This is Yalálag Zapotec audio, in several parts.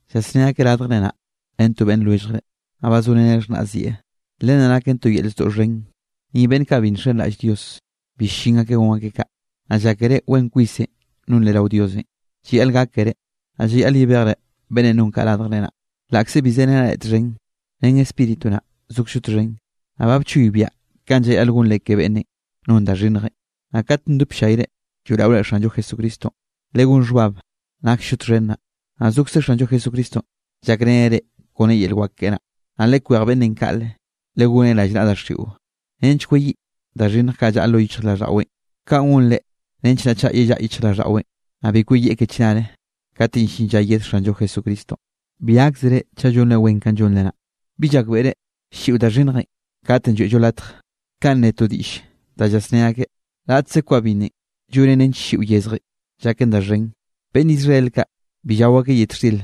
Llasné akeꞌ radjre naꞌ ren to beꞌnn lwelljre, naꞌ ba zoreneꞌ xhnaꞌzieꞌ. Len naken to yel zdoꞌ xhen, ni beꞌnn kaꞌ bi nxenraꞌll Dios, bi ll-llin akeꞌ gon akeꞌ kaꞌ. Naꞌ llákere wen kwisenꞌ nonre rao Diosenꞌ. Llayaꞌl gákere, naꞌ llayaꞌl yebejre beꞌnnenꞌ non kaꞌ radjre naꞌ. Laꞌkze bi zerenaꞌ reꞌ txhen, ren spíritu naꞌ zokzllo txhen, naꞌ ba bchoybiaꞌ kanꞌ llayaꞌl gonre ke beꞌnnenꞌ non da xhinnjenꞌ. Naꞌ kat ndop llayre lloeꞌraore Xanllo Jesucristonꞌ, legón xhbab naksllo txhen naꞌ, naꞌ zokze Xanllo Jesucristonꞌ llakreneꞌ reꞌ kone yel wak keꞌe naꞌ. Naꞌ lekwej beꞌnnenꞌ kaꞌle, legoneꞌ rallnaꞌa daxiꞌo nench kweyiꞌ da xhinnj kaꞌ llaꞌa lo yichjraꞌlldaꞌweꞌn. Kaꞌn gonreꞌ nench naꞌ chaꞌ yellaꞌa lo yichjraꞌlldaꞌweꞌn, naꞌ bi kweyieꞌ ke chnare katenꞌ llin lla yed Xanllo Jesucristonꞌ. Bi gáksere chaꞌ llonre wen kanꞌ llonre naꞌ. ¿Bi llakbeꞌre ll-lliꞌo da xhinnjenꞌ katenꞌ lloeꞌllo latje, kaꞌn ne to diꞌll danꞌ llasné akeꞌ: “Raꞌtze kwa binnenꞌ llonen nench ll-lliꞌo yezjenꞌ llaken da xhen”? Beꞌnn Israel kaꞌ bi llao akeꞌ yet xtir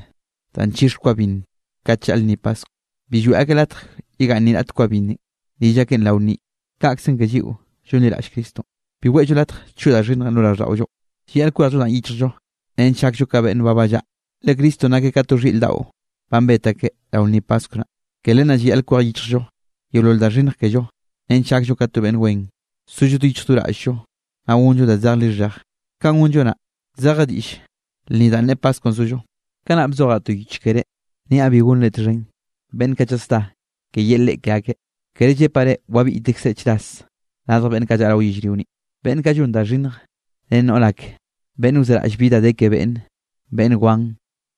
da nchixe kwa binn kat llaꞌl lnni Paskwnꞌ. Bi lloeꞌ akeꞌ latje yegaꞌnn ni raꞌt kwa binnenꞌ rill akeꞌn rao lnninꞌ. Kaꞌkzenꞌ ke lliꞌo llonliraꞌll Cristonꞌ, bi weꞌllo latje choꞌ da xhinnjenꞌ lo raꞌlldaꞌollonꞌ. Llayaꞌl kwejllo danꞌ yichjllo nench gakllo ka beꞌnn ba ballaꞌa, le Cristonꞌ nakeꞌ ka to xhiꞌr daꞌo banꞌ bet akeꞌ rao lnni Paskw naꞌ. Ke len naꞌ llayaꞌl kwej yichjllo yeolol da xhinnj kello nench gakllo ka to beꞌnn wen, sollo do yichj do raꞌll-llo, naꞌ gonllo da zej lixheje. Kanꞌ gonllo naꞌ, zeje diꞌll lnni danꞌ ne Paskwnꞌ zollo. Kanaꞌ bzojaꞌ to yich keré, niaꞌ bi gonre txhen beꞌnn kaꞌ llasdá ke yel reꞌe ke akeꞌ. Ker llepaꞌ reꞌ wabiꞌytekzre chras radj beꞌnn kaꞌ llaꞌa rao yellrio ni, beꞌnn kaꞌ llon da xhinnj ren noꞌr ake, beꞌnn wzeraꞌlle bi da de ke beꞌnne, beꞌnn wan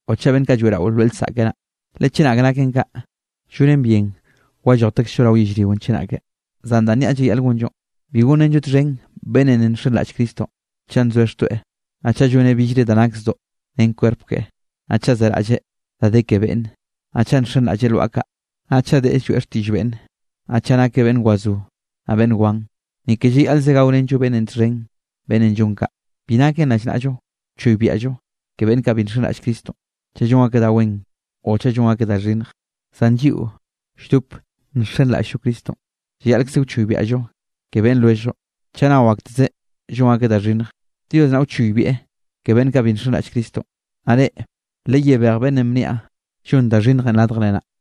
o chaꞌ beꞌnn kaꞌ lloeꞌrao lwaꞌa lsaꞌke naꞌ, le chenak naken kaꞌ, llonen bien wallojtekzllo rao yellrionꞌ chenake. Zan danꞌ niaꞌ llayaꞌl gonllonꞌ, bi gonrenllo txhen beꞌnnenꞌ ne nxenraꞌll Cristonꞌ, chaꞌ nzoeꞌ xtoeꞌ, naꞌ chaꞌ lloneꞌ billre da nak zdoꞌ ren kwerp keꞌe, naꞌ chaꞌ zeraꞌlleꞌ da de ke beꞌnne, naꞌ chaꞌ nxenraꞌlleꞌ lwaꞌa kaꞌ, naꞌ chaꞌ deꞌe lloeꞌ xtiꞌll beꞌnne, naꞌ chaꞌ nakeꞌ beꞌnn wazó naꞌ beꞌnn wan. Ni ke llayaꞌlze gaorenllo beꞌnnenꞌ txhen beꞌnnenꞌ llon kaꞌ. Bi naken rallnaꞌllo wchoybiaꞌllo ke beꞌnn kaꞌ bi nxenraꞌll Cristonꞌ chaꞌ llon akeꞌ da wen o chaꞌ llon akeꞌ da xhinnj, zan lliꞌo lldop nxenraꞌll-llo Cristonꞌ llayaꞌlkze wchoybiaꞌllo ke beꞌnn lwelljllo chaꞌ nao aktezeꞌ llon akeꞌ da xhinnj. Dios naꞌ wchoybiaꞌ ke beꞌnn kaꞌ bi nxenraꞌll Cristonꞌ, naꞌ reꞌ, leyebej beꞌnnenꞌ bniaꞌ llon da xhinnjenꞌ radjre naꞌ.